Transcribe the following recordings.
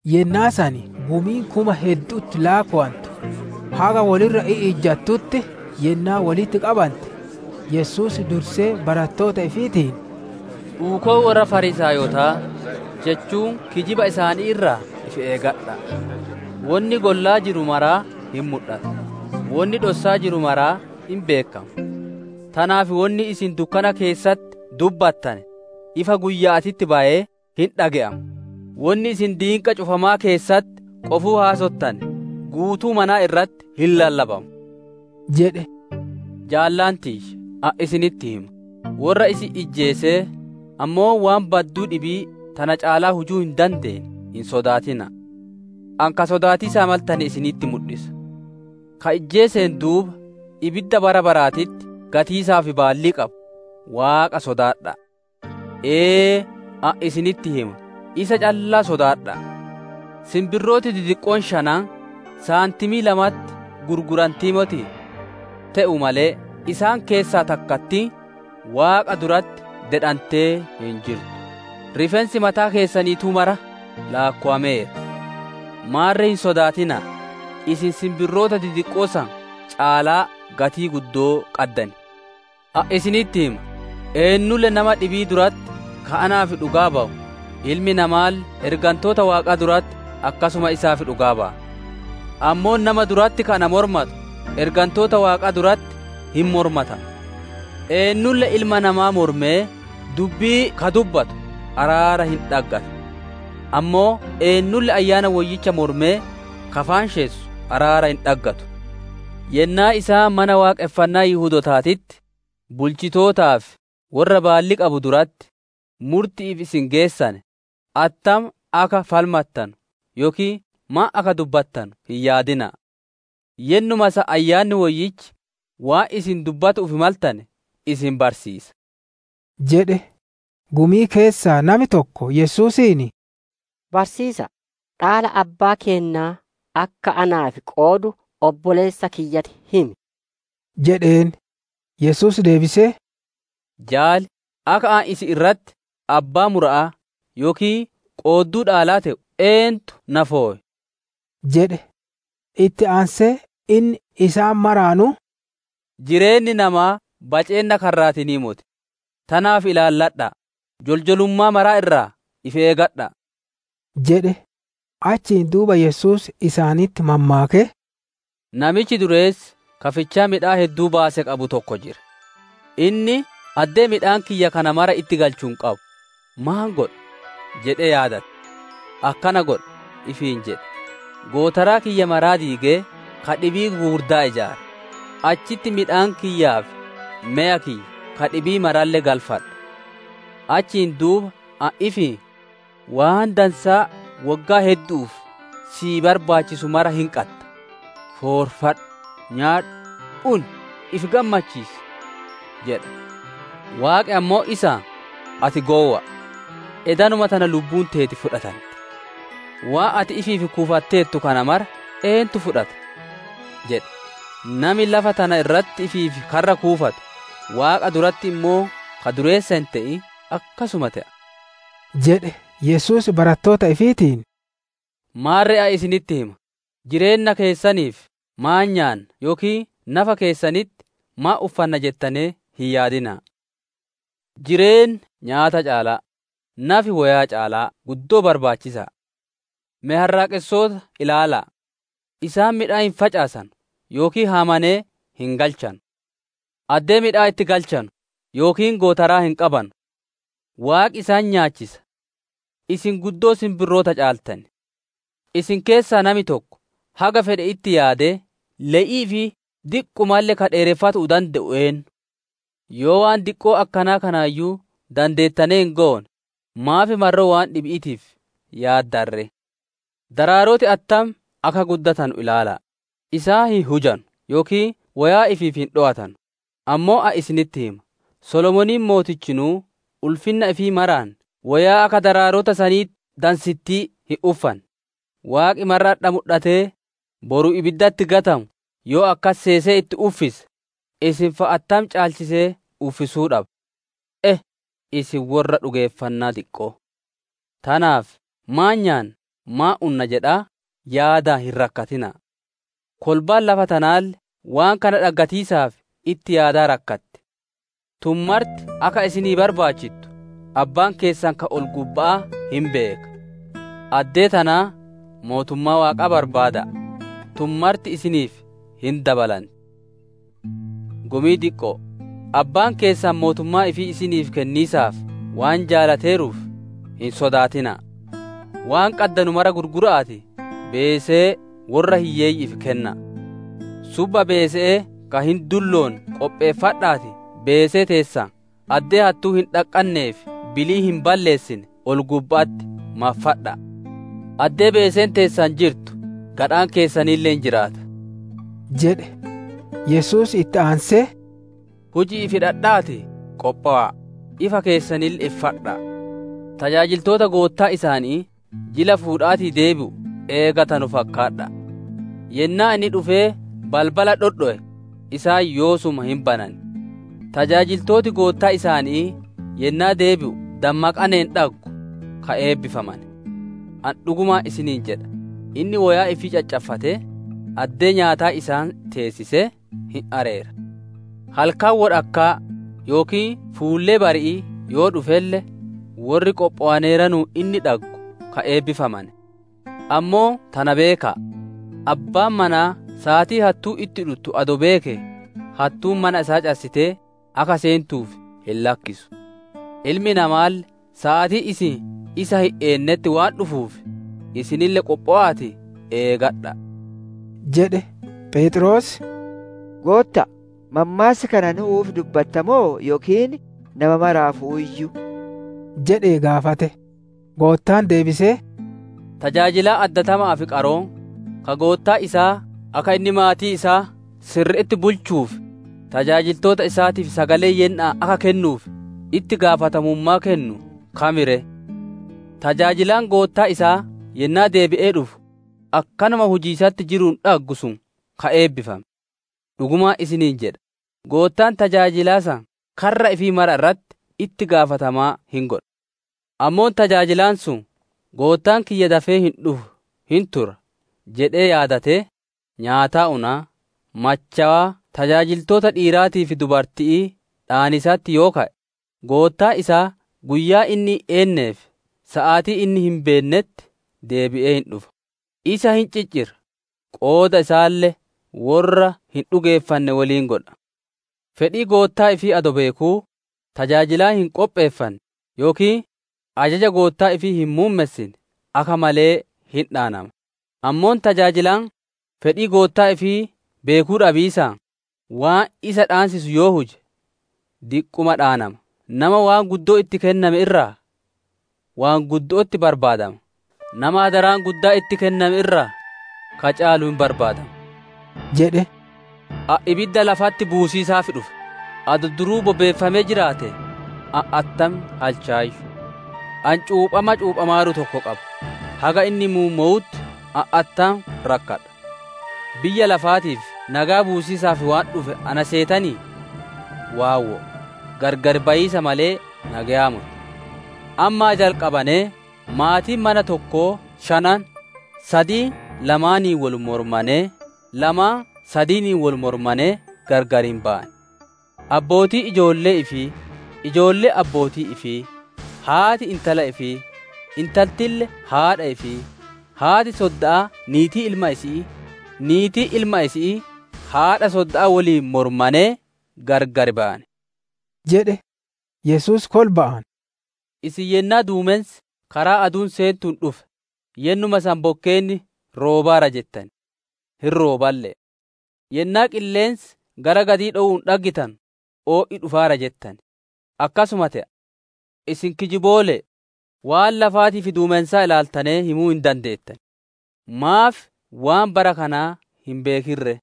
Yennaa san gumiin kuma heddu'utti laakkowantu haga wol irra i'ijjattutti yennaa wolitti qabante, Yesuus dursee barattoota ifiitiin, «Uukoo worra Fariisaayotaa, jechuun kijiba isaanii irraa ifi eegadha'a. Wonni gollaa jiru maraa hin mudhata, wonni dhossaa jiru maraa hin beekkama. Tanaaf wonni isin dukkana keessatti dubbattane, ifa guyya'aatitti bayee hin dhage'ama, wonni isin diinqa cufamaa keessatti qofuu haasottane guutuu manaa irratti hin lallabama» jedhe. «Jaalota tiyya, ani isinitti hima; worra isin ijjeesee ammoo waan badduu dhibii tana caalaa hujuu hin dandeenne hin sodaatina'a. Ani ka sodaatiisaa maltane isinitti mudhisa: Ka ijjeeseen duuba, ibidda bara baraatitti gatiisaaf baallii qabu, Waaqa sodaadha'a. Ee, ani isinitti hima isa callaa sodaadha'a! «Sinbirrooti didiqqoon shanan saantimii lamaanitti gurgurantii motii? Te'uu malee isaan san keessaa takkattiin Waaqa duratti dedhantee hin jirtu. Rifeensi mataa keessaniituu maraa laakkowameera. Maarre hin sodaatina'a; isin sinbirroota didiqqoo san caalaa gatii guddoo qaddan. «Ani isinitti hima, eennulle nama dhibii duratti ka naaf dhugaa bayu, Ilmi Namaalle ergantoota Waaqaa duratti akkasuma isaaf dhugaa baya. Ammoo nama duratti ka na mormatu, ergantoota Waaqaa duratti hin mormatama. Eennulle Ilma Namaa mormee dubbii ka dubbatu araara hin dhaggata; ammoo eennulle Ayyaana Woyyicha mormee ka faanshessu araara hin dhaggatu. «Yennaa isaan Mana Waaqonfannaa Yihudootaatitti, bulchitoota fi worra baallii qabu duratti, murti'iif isin geessane, attam akka falmattanu yookiin maan akka dubbattanu hin yaadina'a. Yennuma san Ayyaanni Woyyichi waan isin dubbatu'uuf maltane isin barsiisa» jedhe. Gumii keessaa nami tokko, Yesuusiin, «Barsiisa'a, dhaala abbaa keennaa, akka naaf qoodu obboleessa kiyyatti himi» jedheen. Yesuus deebisee, «Jaali, akka ani isin irratti abbaa mura'aa yookiin qoodduu dhaalaa te'u eentu na fowe?» jedhe. Itti aansee inni isaan maraanuu, «Jireenni namaa baceenna karraatiinii moti; tanaaf ilaalladha'a, joljolummaa maraa irraa ifi eegadha'a» jedhe. Achiin duuba Yesuus isaanitti mammaakee, «Namichi dureessi ka fichaa midhaan hedduu baase qabu tokko jira. Inni ‹Addee midhaan kiyya kana mara itti galchu hin qabu. Maan godha?› jedhee yaadate. ‹Akkana godha› ifiin jedhe; ‹Gootaraa kiyya maraa diigee ka dhibii gugurdaa ijaara, achitti midhaan kiyyaa fi meya kiyya ka dhibii maralle galfadha. Achiin duuba ani ifiin, Waan dansaa woggaa heddu'uuf sii barbaachisu mara hin qadda; foorfadhu, nyaadhu, uni, ifi gammachiisi!› jedha. Waaqi ammoo isaan, ‹Ati gowwa'a! Edanuma tana lubbuun teeti fudhatanti; waan ati ifiif kuufatteertu kana mara eentu fudhata?› jedhe. «Nami lafa tana irratti ifiif karra kuufatu, Waaqa duratti ammoo ka dureessa hin te'in akkasuma te'a» jedhe. Yesuus barattoota ifiitiin, «Maarre ani isinitti hima, jireenna keessaniif maan nyaanna yookiin nafa keessanitti maan uffanna jettanee hin yaadina'a. Jireenni nyaata caalaa, nafi woyaa caalaa guddoo barbaachisa'a. Me harraaqessoota ilaala'a: isaan midhaan hin facaasanu yookiin haamanee hin galchanu; addee midhaan itti galchanu yookiin gootaraa hin qabanu; Waaqi isaan nyaachisa. Isin guddoo sinbirroota caaltan! Isin keessaa nami tokko haga fedhe itti yaadee le'ii ifii diqqumalle ka dheereffatuu dande'u eennu? Yoo waan diqqoo akkanaa kanaayyuu dandeettanee hin goone, maaf marroo waan dhibi'iitiif yaaddan ree? Daraaroti attam akka guddatanu ilaala'a: Isaan hin hujatanu yookiin woyaa ifiif hin dhowatanu. Ammoo ani isinitti hima, Solomooniin mootichinuu ulfinna ifii maraan woyaa akka daraarota sanii dansittii hin uffanne. Waaqi marra adha mudhatee, boru ibiddatti gatamu yoo akkas seesee itti uffise, isin fa'a attam caalchisee uffisuu dhaba. E, isin worra dhugeeffannaa diqqo'oo! «Tanaaf ‹Maan nyaanna? Maan unna?› jedhaa yaadaan hin rakkatina'a. Kolbaan lafa tanaalle waan kana dhaggatiisaaf itti yaadaa rakkatti. Tun marti akka isinii barbaachittu Abbaan keessan ka ol-gubba'aa hin beeka. Addee tanaa, mootummaa Waaqaa barbaada'a, tun marti isiniif hin dabalanti. «Gumii diqqo'o, Abbaan keessan mootummaa ifii isinii kenniisaaf waan jaalateeruuf, hin sodaatina'a. Waan qaddanu mara gurgura'aatii beesee worra hiyyeeyyi'iif kenna'a. Subba beese'ee ka hin dulloonne qopheeffadha'aatii beesee teessan addee hattuun hin dhaqqannee fi biliin hin balleessine ol-gubba'atti maffadha'a. Addee beeseen teessan jirtu gadhaan keessanille hin jiraata» jedhe. Yesuus itti aansee, «Huji'iif hidhadha'aatii qophowa'a, ifa keessanille iffadha'a! Tajaajiltoota goottaan isaanii jila fuudhaatii deebi'u eegatanu fakkaadha'a. Yennaa inni dhufee balbala dhodhowe, isaan yoosuma hin banan. Tajaajiltooti goottaan isaanii yennaa deebi'u dammaqaneeranuun dhaggu, ka eebbifamane. Ani dhugumaan isiniin jedha, inni woyaa ifii caccaffatee, addee nyaataa isaan teessisee hin areera. Halkan wodhakkaa yookiin fuullee bari'ii yoo dhufelle, worri qophowaneeranuun inni dhaggu ka eebbifamane! Ammoo tana beeka'a: abbaan manaa saatii hattuun itti dhuttu adoo beekee, hattuun mana isaa cassitee akka seentuuf hin lakkisu. Ilmi Namaalle saatii isin isa hin eennetti waan dhufuuf, isinille qophowa'aatii eegadha'a!» jedhe. Pheexroos, «Gootta'a, mammaassa kana nu'uuf dubbatta moo yookiin nama maraafuu?» jedhee gaafate. Goottaan deebisee, «Tajaajilaan addatama'aa fi qaroon, ka goottaan isaa akka inni maatii isaa sirri'itti bulchuu fi tajaajiltoota isaatiif sagalee yenna'aan akka kennuuf itti gaafatamummaa kennu kam ree? Tajaajilaan goottaan isaa yennaa deebi'ee dhufu akkanuma hojjatiisatti jiruun dhaggu sun ka eebbifame! Dhugumaan isiniin jedha, goottaan tajaajilaa san karra ifii mara irratti itti gaafatamaa hin godha. Ammoo tajaajilaan sun, ‹Goottaan kiyya dafee hin dhufu hin tura› jedhee yaadatee, nyaataa unaa, machowaa tajaajiltoota dhiiraatii fi dubarti'ii dhaaniisatti yoo ka'e, goottaan isaa guyyaa inni hin eennee fi saatii inni hin beennetti deebi'ee hin dhufa, isa hin ciccira, qooda isaalle worra hin dhugeeffanne woliin godha. «Fedhii goottaa ifii adoo beekuu tajaajilaan hin qopheeffanne, yookiin ajaja goottaa ifii hin muummessine akka malee hin dhaanama. Ammoo tajaajilaan fedhii goottaa ifii beekuu dhabiisaan, waan isa dhaansisu yoo huje, diqquma dhaanama. Nama wonni guddoon itti kennante irraa waan guddo'otti barbaadama; nama maganneen guddoon itti kennante irraa ka caalu hin barbaadama» jedhe. «Ani ibidda lafatti buusiisaaf dhufe, adoo duruu bobeeffamee jiraate ani attam halchaayyu! Ani cuuphama cuuphamaaru tokko qaba, haga inni muummowutti ani attam rakkadha! Biyya lafaatiif nageya buusiisaaf waan dhufe na seetanii? Waawwoo, gargar bayiisa malee nageyaa moti. Ammaa jalqabanee maatiin mana tokkoo shanan, sadiin lamaaniin wol mormanee lamaan sadiiniin wol mormanee gargar hin bayan. Abbootiin ijoollee ifii, ijoolleen abbootii ifii, haati intala ifii, intaltille haadha ifii, haati sodda'aa niitii ilma isi'ii, niitiin ilma isi'ii haadha sodda'aa woliin mormanee gargar bayan» jedhe. Yesuus kolba'aan, «Isin yennaa duumensi karaa aduun seentuun dhufe, yennuma san bokkeenni roobaara jettan; hin rooballe'e. Yennaa qilleensi gara gadii dhowu dhaggitanu, o'i dhufaara jettan; akkasuma te'a. Isin kijiboole'e! Waan lafaatii fi duumensaa ilaaltanee himuu hin dandeettan; maaf waan bara kanaa hin beekin ree?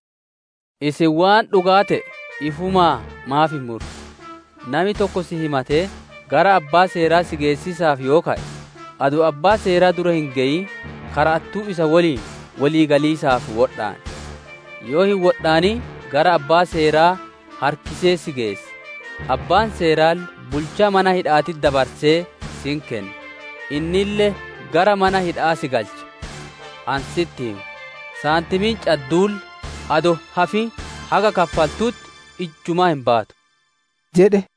«Isin waan dhugaa te'e ifumaa maaf hin murre? Nami tokko si himatee gara abbaa seeraa si geessiisaaf yoo ka'e, adoo abbaa seeraa dura hin geyin kara'attuu isa woliin wolii galiisaaf wodhaan. Yoo hin wodhaanin gara abbaa seeraa harkisee si geessa, abbaan seeraalle bulchaa mana hidha'aatitti dabarsee si hin kenna, innille gara mana hidha'aa si galcha. Ani sitti hima, saantimiin cadduulle adoo hin hafin haga kaffaltutti ijjumaa hin baatu» jedhe.